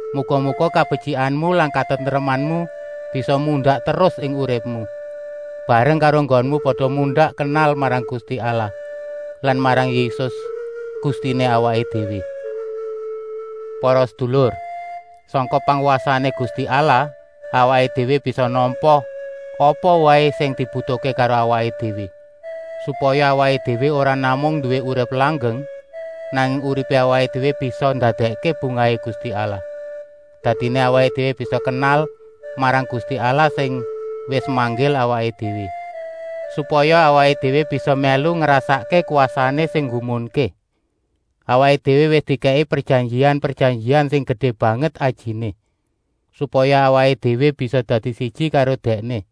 Muga-muga kabetyikan lan katentreman bisa mundak terus ing uripmu, bareng karo enggonmu pada mundak kenal marang Gusti Allah lan marang Yésus, Gustiné awaké déwé. Para sedulur, sangka pangwasané Gusti Allah awaké déwé bisa nampa apa waé sing dibutuhké karo awaké déwé, supaya awaké déwé ora namung nduwé urip langgeng, nanging uripé awaké déwé bisa ndadèkké bungahé Gusti Allah. Dadiné awaké déwé bisa kenal marang Gusti Allah sing wis manggil awaké déwé, supaya awaké déwé bisa mèlu ngrasakké kwasané sing nggumunké. Awaké déwé wis dikèki prejanjian-prejanjian sing gedé banget ajiné, supaya awaké déwé bisa dadi siji karo Dèkné.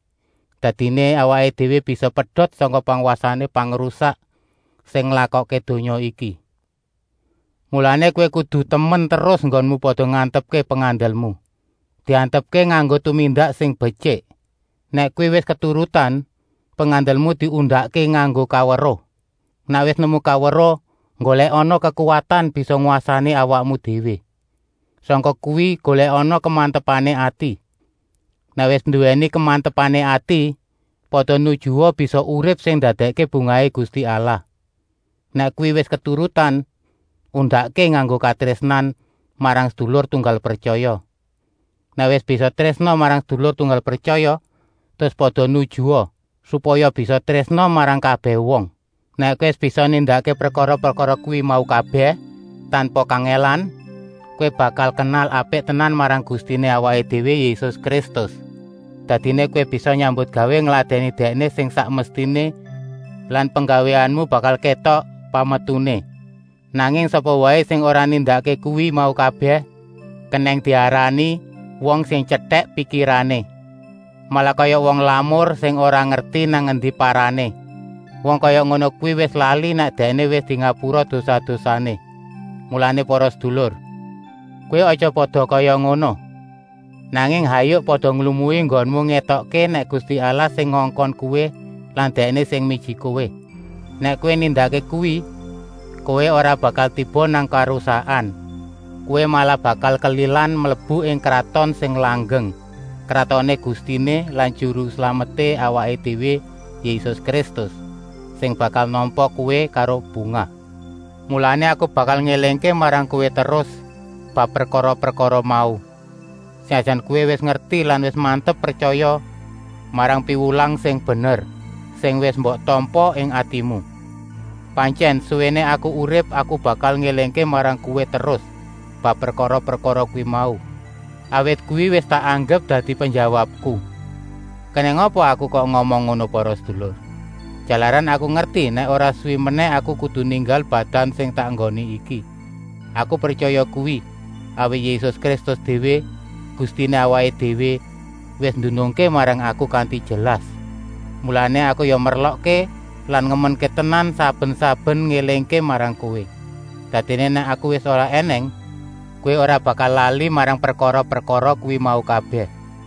Dadiné awaké déwé bisa pedot sangka pangwasané pangrusak sing nglakokké donya iki. Mulané kowé kudu temen terus enggonmu pada ngantepké pengandelmu. Diantepké nganggo tumindak sing betyik. Nèk kuwi wis keturutan, pengandelmu diundakké nganggo kaweruh. Nèk wis nemu kaweruh, nggolèkana kekuwatan bisa ngwasani awakmu déwé. Sangka kuwi golèkana kemantepané ati. Nèk wis nduwèni kemantepané ati, pada nujua bisa urip sing ndadèkké bungahé Gusti Allah. Nèk kuwi wis keturutan, undakké nganggo katrésnan marang sedulur tunggal pretyaya. Nèk wis bisa trésna marang sedulur tunggal pretyaya terus pada nujua, supaya bisa trésna marang kabèh wong. Nèk kowé wis bisa nindakké prekara-prekara kuwi mau kabèh tanpa kangèlan, kowé bakal kenal apik tenan marang Gustiné awaké déwé Yésus Kristus. Dadiné kowé bisa nyambutgawé ngladèni Dèkné sing sak mestiné lan penggawéanmu bakal kétok pametuné. Nanging sapa waé sing ora nindakké kuwi mau kabèh kenèng diarani wong sing tyetèk pikirané. Malah kaya wong lamur sing ora ngerti nang endi parané. Wong kaya ngono kuwi wis lali nèk dèkné wis dingapura dosa-dosané. Mulané para sedulur, kowé aja pada kaya ngono, nanging hayuk pada nglumui enggonmu ngétokké nèk Gusti Allah sing ngongkon kowé lan Dèkné sing miji kowé. Nèk kowé nindakké kuwi, kowé ora bakal tiba nang karusakan. Kowé malah bakal kelilan mlebu ing kraton sing langgeng, kratoné Gustiné lan Juru Slameté awaké déwé Yésus Kristus, sing bakal nampa kowé karo bungah. Mulané aku bakal ngélingké marang kowé terus bab prekara-prekara mau, senajan kowé wis ngerti lan wis mantep pretyaya marang piwulang sing bener, sing wis mbok tampa ing atimu. Pantyèn, suwéné aku urip aku bakal ngélingké marang kowé terus bab prekara-prekara kuwi mau, awit kuwi wis tak anggep dadi penjawabku. Kenèng apa aku kok ngomong ngono para sedulur? Jalaran aku ngerti nèk ora suwi menèh aku kudu ninggal badan sing tak enggoni iki. Aku pretyaya kuwi, awit Yésus Kristus déwé, Gustiné awaké déwé, wis ndunungké marang aku kanti jelas. Mulané aku ya merlokké lan ngemenké tenan saben-saben ngélingké marang kowé, dadiné nèk aku wis ora ènèng, kowé ora bakal lali marang prekara-prekara kuwi mau kabèh.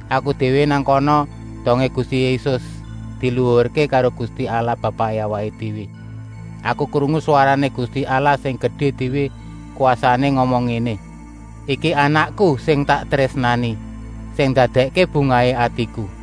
Aku déwé nang kana dongé Gusti Yésus diluhurké karo Gusti Allah Bapaké awaké déwé. Aku krungu swarané Gusti Allah sing gedé déwé kwasané ngomong ngéné: “Iki Anakku sing tak trésnani, sing ndadèkké bungahé atiku.”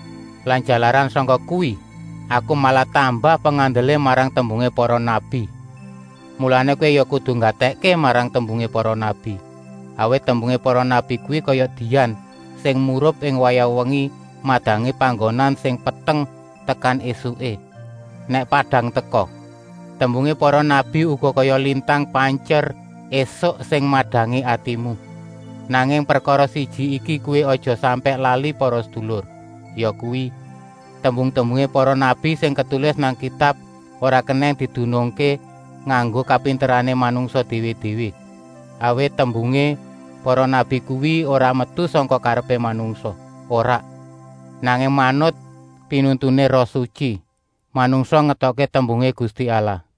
Lan jalaran sangka kuwi aku malah tambah pengandelé marang tembungé para nabi. Mulané kowé ya kudu nggatèkké marang tembungé para nabi, awit tembungé para nabi kuwi kaya dian sing murup ing wayah wengi madangi panggonan sing peteng, tekan ésuké, nèk padang teka. Tembungé para nabi uga kaya lintang panjer ésuk sing madangi atimu. Nanging prekara siji iki kowé aja sampèk lali para sedulur, yakuwi: tembung-tembungé para nabi sing ketulis nang Kitab ora kenèng didunungké nganggo kapinterané manungsa déwé-déwé. Awit tembungé para nabi kuwi ora metu sangka karepé manungsa, ora, nanging manut pinuntuné Roh Sutyi manungsa ngetokké tembungé Gusti Allah.